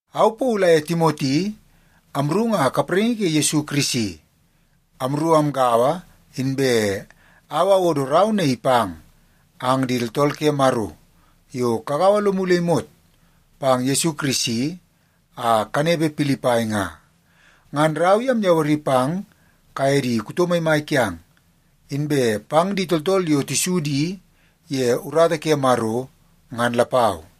Au Paulu aye Timoti amru nga kapraingi ke Yesu Kirisi. Amru amgaua, inbe au awodo rau naii pang ang di tooltool ke Maro yo kagaua lomu le imot pang Yesu Kirisi a kanepe Pilipai nga. Ngan rau i amyawari pang kaye di kuto maimai kiang, inbe pang di tooltool yo tisu di ye urata ke Maro ngan lapau.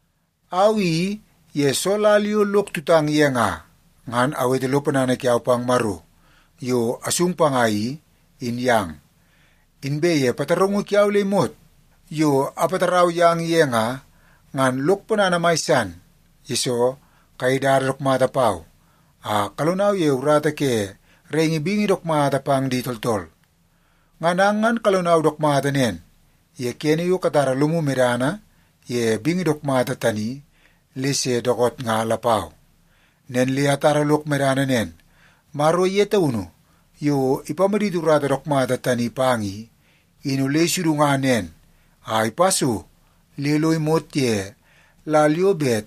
Au i ye soo lal yo lok tutang ye nga, ngan awete lo ponana kiau pang Maro yo asung panga i, in yang. Inbe ye pataraungu kiau le imot yo apatarau yang ye nga, ngan lok ponana mai san, yesoo kayei dada dook mata pau a kalonau ye urata ke raingi bingi dook mata pang di tooltool. Ngan ang ngan kalonau dook mata nen ye kene yo katara lomu medana ye bingi dook mata tani le se dookoot nga lapau. Nen le atara lok medana nen, Maro ye taunu yo ipamaditi urata dook mata tani pang i, in ole isudunga nen a ipa so le lo imot ye lal yo bet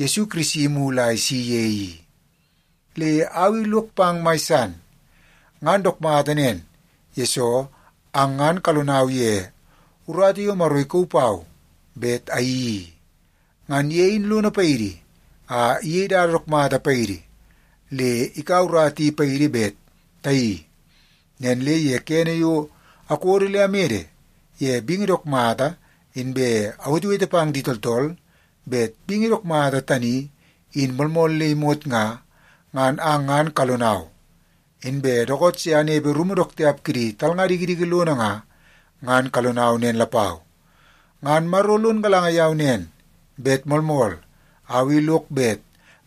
Yesu Kirisi imulu a isi ye i. Le au i lok pang mai san. Ngan dook mata nen, yesoo ang ngan kalonau ye urata yo Maro ikauu pau bet ayeii i. Ngan ye in lono paidi a iyei dada dook mata paidi le ikaua urata i paidi bet tayeii. Nen le ye kene yo akodo le amede ye bingi dook mata inbe awetewete pang di tooltool bet bingi dook mata tani in moolmool le imot nga, ngan ang ngan kalonau. Inbe dookoot se anepe rumu dook tiap kidi talnga dikidiki lono nga, ngan kalonau nen lapau. Ngan Maro lon galanga yau nen, bet moolmool au i lok bet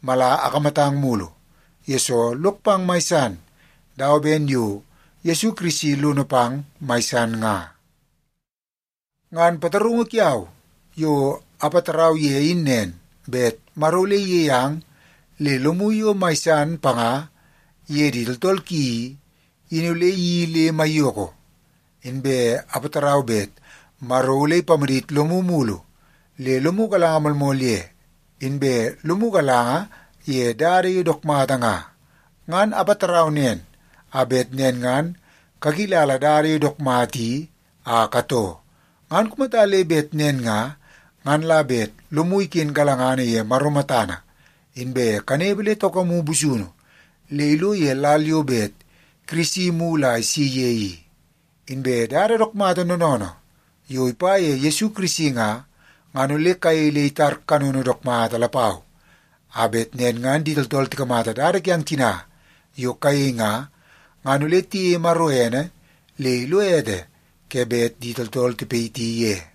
mala akamatang mulu, yesoo lok pang mai san dawa ben yo Yesu Kirisi lono pang mai san nga. Ngan pataraungu kiau yo apatarau ye in nen, bet Maro ole iyei ang le lomu yo mai san panga iye di tooltool ki i, in ole iyeii le maiyoko. Inbe apatarau bet Maro ole ipamadit lomu mulu le lomu galanga moolmool ye, inbe lomu galanga ye dada yo dook mata nga. Ngan apatarau nen, a bet nen ngan kakilala dada yo dook mata i a katoo. Ngan kumata le bet nen nga, ngan la bet lomu iken galangana ye Maro matana, inbe kanepe le taukamu busunu le ilo ye lal yo bet Kirisi imulu a isi ye i. Inbe dada dook mata noonoonoo yo ipa ye Yesu Kirisi nga, ngan ole kayei le itar kanono dook mata lapau, a bet nen ngan di tooltool tikamata dada kiang tina yo kayei nga, ngan ole tiyeie Maro ene le ilo ete ke bet di tooltool tipayiti ye.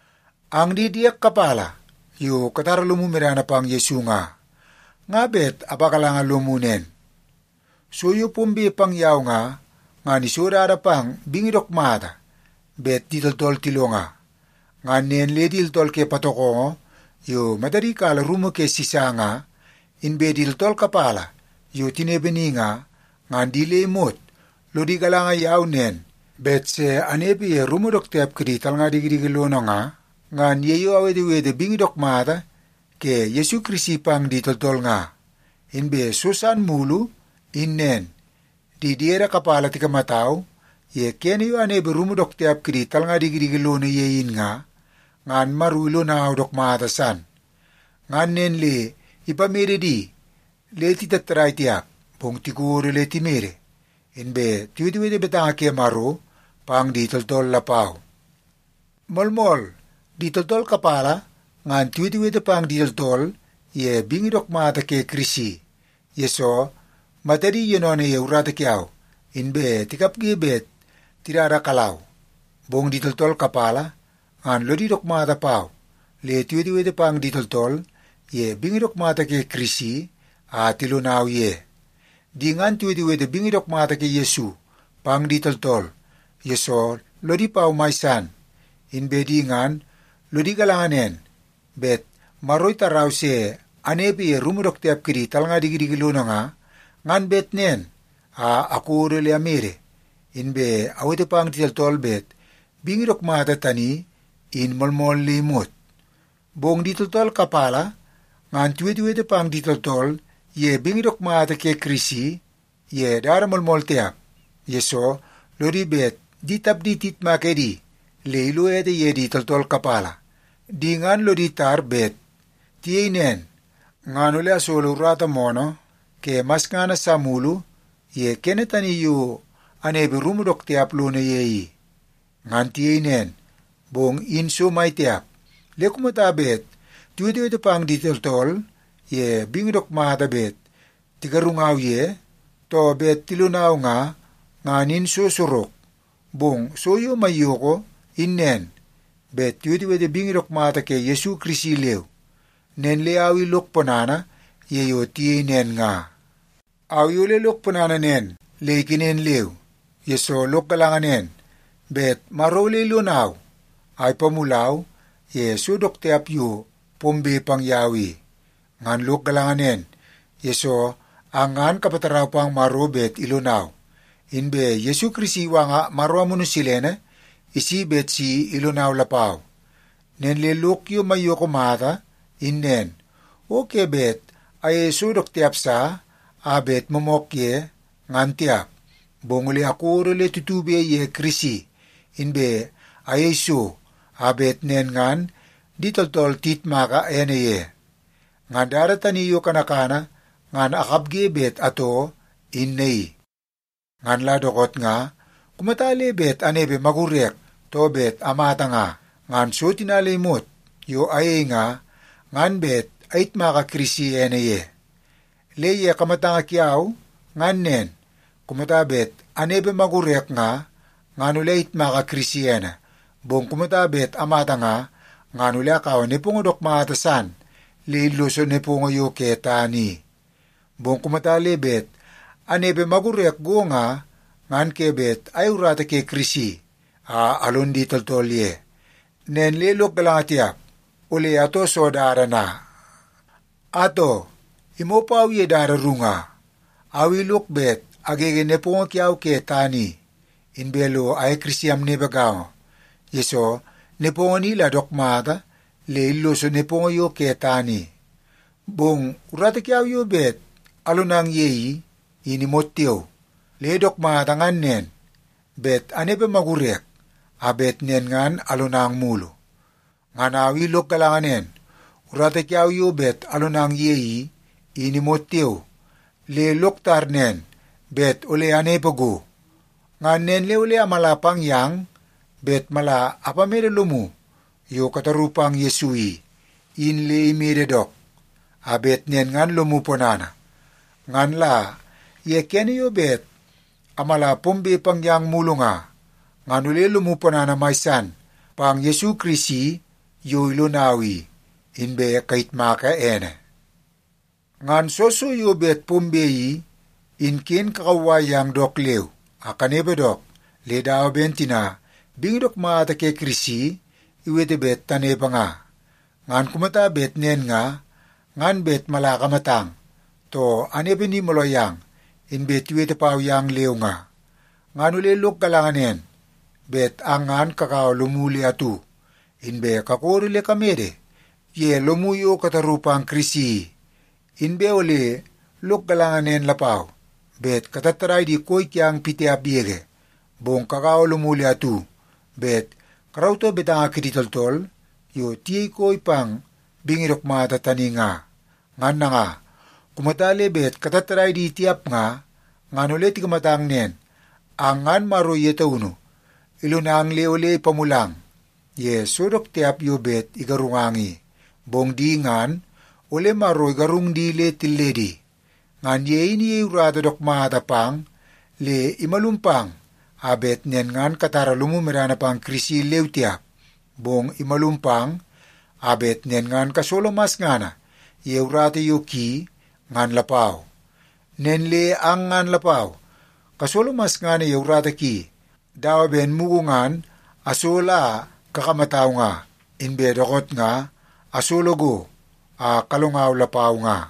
Ang di diek kapala yo katara lomu medana pang Yesu nga, nga bet apagalanga lomu nen. So yo pombe pang yau nga, ngan iso dada pang bingi dook mata bet di tooltool tilonga. Ngan nen le di tooltool ke patokongo yo matadi kala rumu ke Sisa nga, inbe di tooltool kapala yo tinepe ni nga, ngan di le imot lodi galanga yau nen bet se anepe ye rumu dook tiap kidi talnga dikidiki lono nga, ngan ye yo awetewete bingi dook mata ke Yesu Kirisi pang di tooltool nga. Inbe so san mulu in nen. Di diede kapala tikamatau ye kene yo anepe rumu dook tiap kidi talnga dikidiki lono ye in nga, ngan Maro ilonau dook mata san. Ngan nen le ipamede di le titattadai tiap, bong tikodo le timede, inbe tiwetewete betanga ke Maro pang di tooltool lapau. Moolmool, di tooltool kapala ngan tiwetewete pang di tooltool ye bingi dook mata ke Kirisi, yesoo matadi yoonoonoo ye urata kiau, inbe tikapge bet tidada kalau. Bong di tooltool kapala ngan lodi dook mata pau le tiwetewete pang di tooltool ye bingi dook mata ke Kirisi a tilonau ye. Di ngan tiwetewete bingi dook mata ke Yesu pang di tooltool, yesoo lodi pau mai san. Inbe di ngan lodi galanga nen bet Maro itarau se anepe ye rumu dook tiap kidi talnga dikidiki lono nga, ngan bet nen a akodo le amede, inbe awete pang di tooltool bet bingi dook mata tani in moolmool le imot. Bong di tooltool kapala ngan tiwetewete pang di tooltool ye bingi dook mata ke Kirisi ye dada moolmool tiap, yesoo lodi bet di tapdi tiyitmak edi le ilo ete ye di tooltool kapala. Di ngan lodi tar bet tiyei nen ngan ole asolo urata moonoo ke masngana sa mulu ye kene tani yo anepe rumu dook tiap lono ye i. Ngan tiyei nen, bong in so mai tiap. Le kumata bet tiwetewete pang di tooltool ye bingi dook mata bet tigarungau ye, too bet tilonau nga, ngan in so sorok. Bong so yo maiyoko in nen, bet tiwetewete bingi dook mata ke Yesu Kirisi leu. Nen le au i lok ponana ye yo tiyei nen nga. Au i ole lok ponana nen le ikenen leu, yesoo lok galanga nen, bet Maro ole ilonau a ipamulau ye so dook tiap yo pombe pang yau i. Ngan lok galanga nen, yesoo ang ngan kapatarau pang Maro bet ilonau, inbe Yesu Kirisi iwanga Maro Amunu Silene isi bet si ilonau lapau. Nen le lok yo maiyoko mata in nen, o ke bet ayeie so dook tiap sa a bet moomook ye, ngan tiap, bong ole akodo tutube ye Kirisi, inbe ayei so a bet nen ngan di tooltool tiyitmaka ene ye. Ngan dada tani yo kanakana ngan akapge bet atoo in naii. Ngan la dookoot nga, kumata le bet anepe magurek, too bet amata nga, ngan so tina le imot yo ayei nga, ngan bet ayitmaka Kirisi ene ye. Le ye kamatanga kiau ngan nen, kumata bet anepe magurek nga, ngan ole ayitmaka Kirisi ene, bong kumata bet amata nga, ngan ole akaua nepongo dook mata san le illoso nepongo yo ke tana i. Bong kumata le bet anepe magurek go nga, ngan ke bet ayei urata ke Kirisi a alon di tooltool ye. Nen le lok galanga tiap, ole atoo soo dada na? Atoo, imoo pau ye dada ru nga. Au i lok bet agege nepongo kiau ke tana i, inbe lo aye Kirisi amnepe gaongo, yesoo nepongo ni la dook mata le illoso nepongo yo ke tana i. Bong urata kiau yo bet alonang ye i, in imot tiao. Le dook mata ngan nen, bet anepe magurek a bet nen ngan alonang mulu. Ngan au i lok galanga nen, urata kiau yo bet alonang ye i, in imot tiao. Le lok tar nen bet ole anepe go. Ngan nen le ole amala pang yang bet mala apamede lomu yo kataru pang Yesu i, in le imede dook, a bet nen ngan lomu ponana. Ngan la ye kene yo bet amala pombe pang yang mulu nga, ngan ole lomu ponana mai san pang Yesu Kirisi yo ilonau i, inbe kayitmaka ene. Ngan soo so yo bet pombe i, in ken kakauwai ang dook leu a kanepe dook le dawa ben tina bingi dook mata ke Kirisi iwete bet tanepe nga. Ngan kumata bet nen nga, ngan bet mala akamatang, too anepe ni mooloo yang inbe tiwete pau yang leu nga, ngan ole lok galanga nen, bet ang ngan kagaua lomu le atu, inbe kakodo le kamede ye lomu yo kataru pang Kirisi i. Inbe ole lok galanga nen lapau, bet katattadai di koi kiang pitiap yege, bong kagaua lomu le atu bet karautoo betanga kidi tooltool yo tiyei koi pang bingi dook mata tani nga. Ngan nanga, kumata le bet katattadai di tiap nga, ngan ole tikamatang nen; ang ngan Maro ye taunu ilonang le ole ipamulang ye so dook tiap yo bet igarungang i, bong di ngan ole Maro igarung di le tilledi. Ngan ye in iyei urata dook mata pang le imalum pang a bet nen ngan katara lomu medana pang Kirisi leu tiap, bong imalum pang a bet nen ngan kasolo masngana ye urata yo ki, ngan lapau. Nen le ang ngan lapau kasolo masngana ye urata ki dawa ben mugu ngan asolo a kakamatau nga, inbe dookoot nga asolo go a kalongau lapau nga.